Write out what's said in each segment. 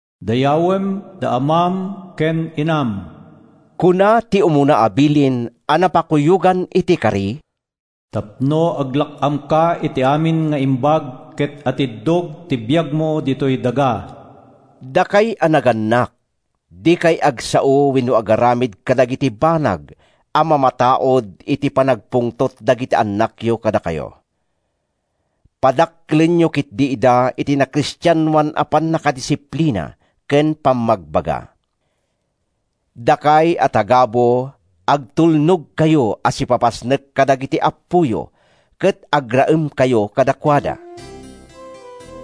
“Dayawem da amam ken inam,” kuna ti umuna a bilin a napakuyogan iti kari, “tapno aglak-amka iti amin nga imbag ket atiddog ti biagmo ditoy daga.” Dakay a nagannak, dikay agsao wenno agaramid kadagiti banag a mamataud iti panagpungtot dagiti annakyo kadakayo. Padakkelenyo ketdi ida iti nakristianoan a pannakadisiplina ken pammagbaga. Dakay a tagabu, agtulnogkayo a sipapasnek kadagiti appoyo ket agraemkayo kadakuada.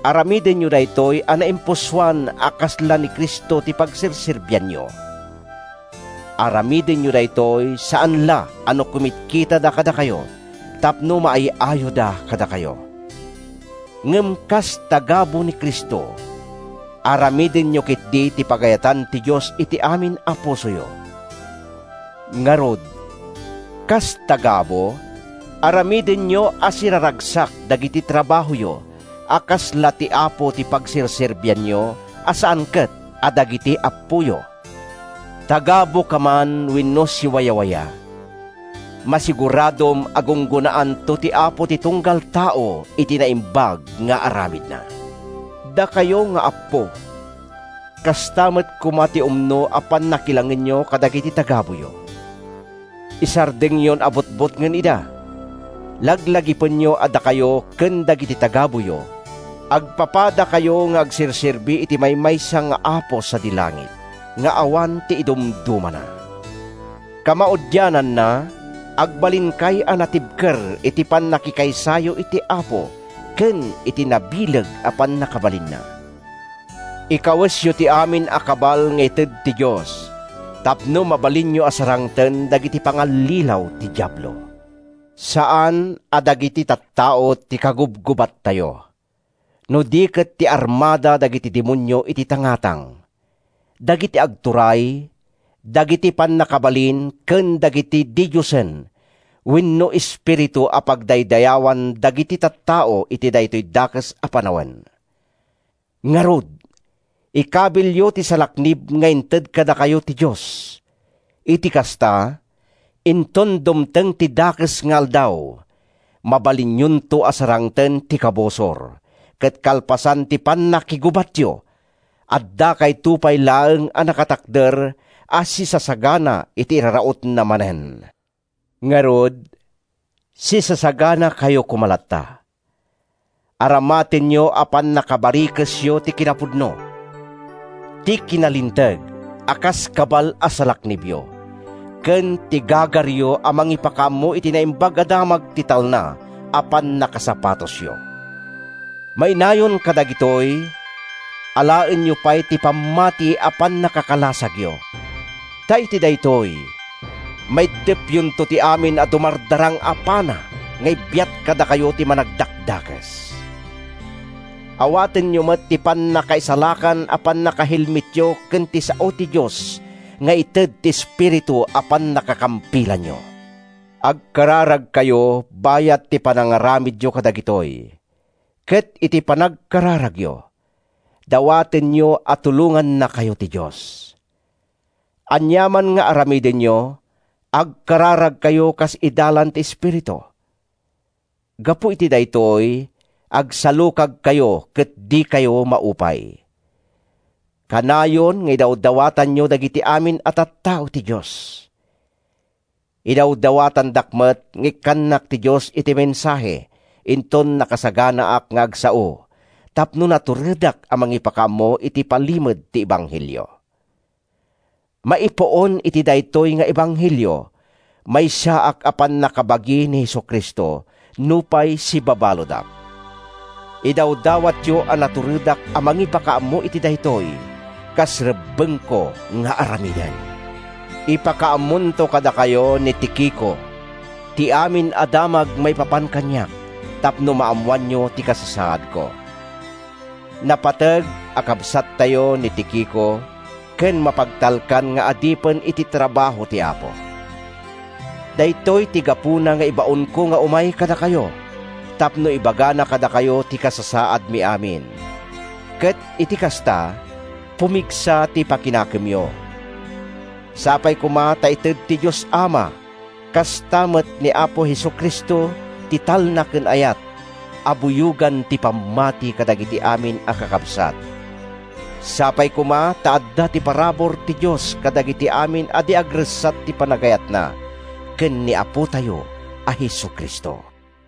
Aramidenyo daytoy a naimpusoan a kasla ni Cristo ti pagserserbianyo. Aramidenyo daytoy saan la a no kumitkitada kadakayo tapno maay-ayoda kadakayo. Ngem kas tagabu ni Cristo, aramidenyo ketdi ti pagayatan ti Dios iti amin a pusoyo. Ngarud, kas tagabu, aramidenyo a siraragsak dagiti trabahoyo a kasla ti Apo ti pagserserbianyo, a saan ket a dagiti appoyo. Tagabuka man wenno siwawaya, masiguradom a gunggonaanto ti Apo ti tung-gal tao iti naimbag nga aramid-na. Dakayo nga appo, kasta met koma ti umno a pannakilangenyo kadagiti tagabuyo. Isardengyon a butbutngen ida. Laglagipenyo a dakayo ken dagiti tagabuyo, agpapadakayo nga agserserbi iti maymaysa nga Apo sadi langit nga awan ti idumdumana. Kamaudiananna, agbalinkay a natibker iti pannakikaysayo iti Apo ken iti nabileg a pannakabalinna. Ikawesyo ti amin a kabal nga ited ti Dios tapno mabalinyo a sarangten dagiti pangallilaw ti Diablo. Saan a dagiti tattao ti kagubgubattayo, no di ket ti armada dagiti demonio iti tangatang, dagiti agturay, dagiti pannakabalin ken dagiti didiosen wenno espiritu a pagdaydayawan dagiti tattao iti daytoy dakes a panawen. Ngarud, ikabilyo ti salaknib nga inted kadakayo ti Dios! Iti kasta, inton dumteng ti dakes nga aldaw, mabalinyonto a sarangten ti kabusor, ket kalpasan ti pannakigubatyo, addakayto pay laeng a nakatakder a sisasagana iti irarautna ma-nen. Ngarud, sisasaganakayo koma latta. Aramatenyo a pannakabarikesyo ti kinapudno, ti kinalinteg a kas kabal a salaknibyo ken ti gagaryo a mangipakaammo iti Naimbag a Damag ti talna a pannakasapatosyo. Mainayon kadagitoy, alaenyo pay ti pammati a pannakakalasagyo, ta iti daytoy, maiddepyonto ti amin a dumardarang a pana nga ibiat kadakayo ti Managdakdakes. Awatenyo met ti pannakaisalakan a pannakahelmetyo ken ti sao ti Dios nga ited ti Espiritu a pannakakampilanyo. Agkararagkayo bayat ti panangaramidyo kadagitoy ket iti panagkararagyo, dawatenyo a tulongannakayo ti Dios. Aniaman nga aramidenyo, agkararagkayo kas idalan ti Espiritu. Gapu iti daytoy, agsalukagkayo ket dikayo maupay. Kanayon nga idawdawatanyo dagiti amin a tattao ti Dios. Idawdawatandak met nga ikkannak ti Dios iti mensahe inton nakasaganaak nga agsao tapno naturedak a mangipakaammo iti palimed ti ebanghelio. Maipuon iti daytoy nga ebanghelio, maysaak a pannakabagi ni Jesu-Cristo nupay sibabaludak. Idawdawatyo a naturedak a mangipakaammo iti daytoy, kas rebbengko nga aramiden. Ipakaammonto kadakayo ni Tikico ti amin a damag maipapan kaniak tapno maammoanyo ti kasasaadko. Napateg a kabsattayo ni Tikico ken mapagtalkan nga adipen iti trabaho ti Apo. Daytoy ti gapuna nga ibaonko nga umay kadakayo—tapno ibagana kadakayo ti kasasaadmi amin, ket iti kasta, pumigsa ti pakinakemyo. Sapay koma ta ited ti Dios Ama, kasta met ni Apo Jesu-Cristo, ti talna ken ayat a buyogen ti pammati kadagiti amin a kakabsat. Sapay koma ta adda ti parabur ti Dios kadagiti amin a di agressat ti panagayatna ken ni Apotayo a Jesu-Cristo.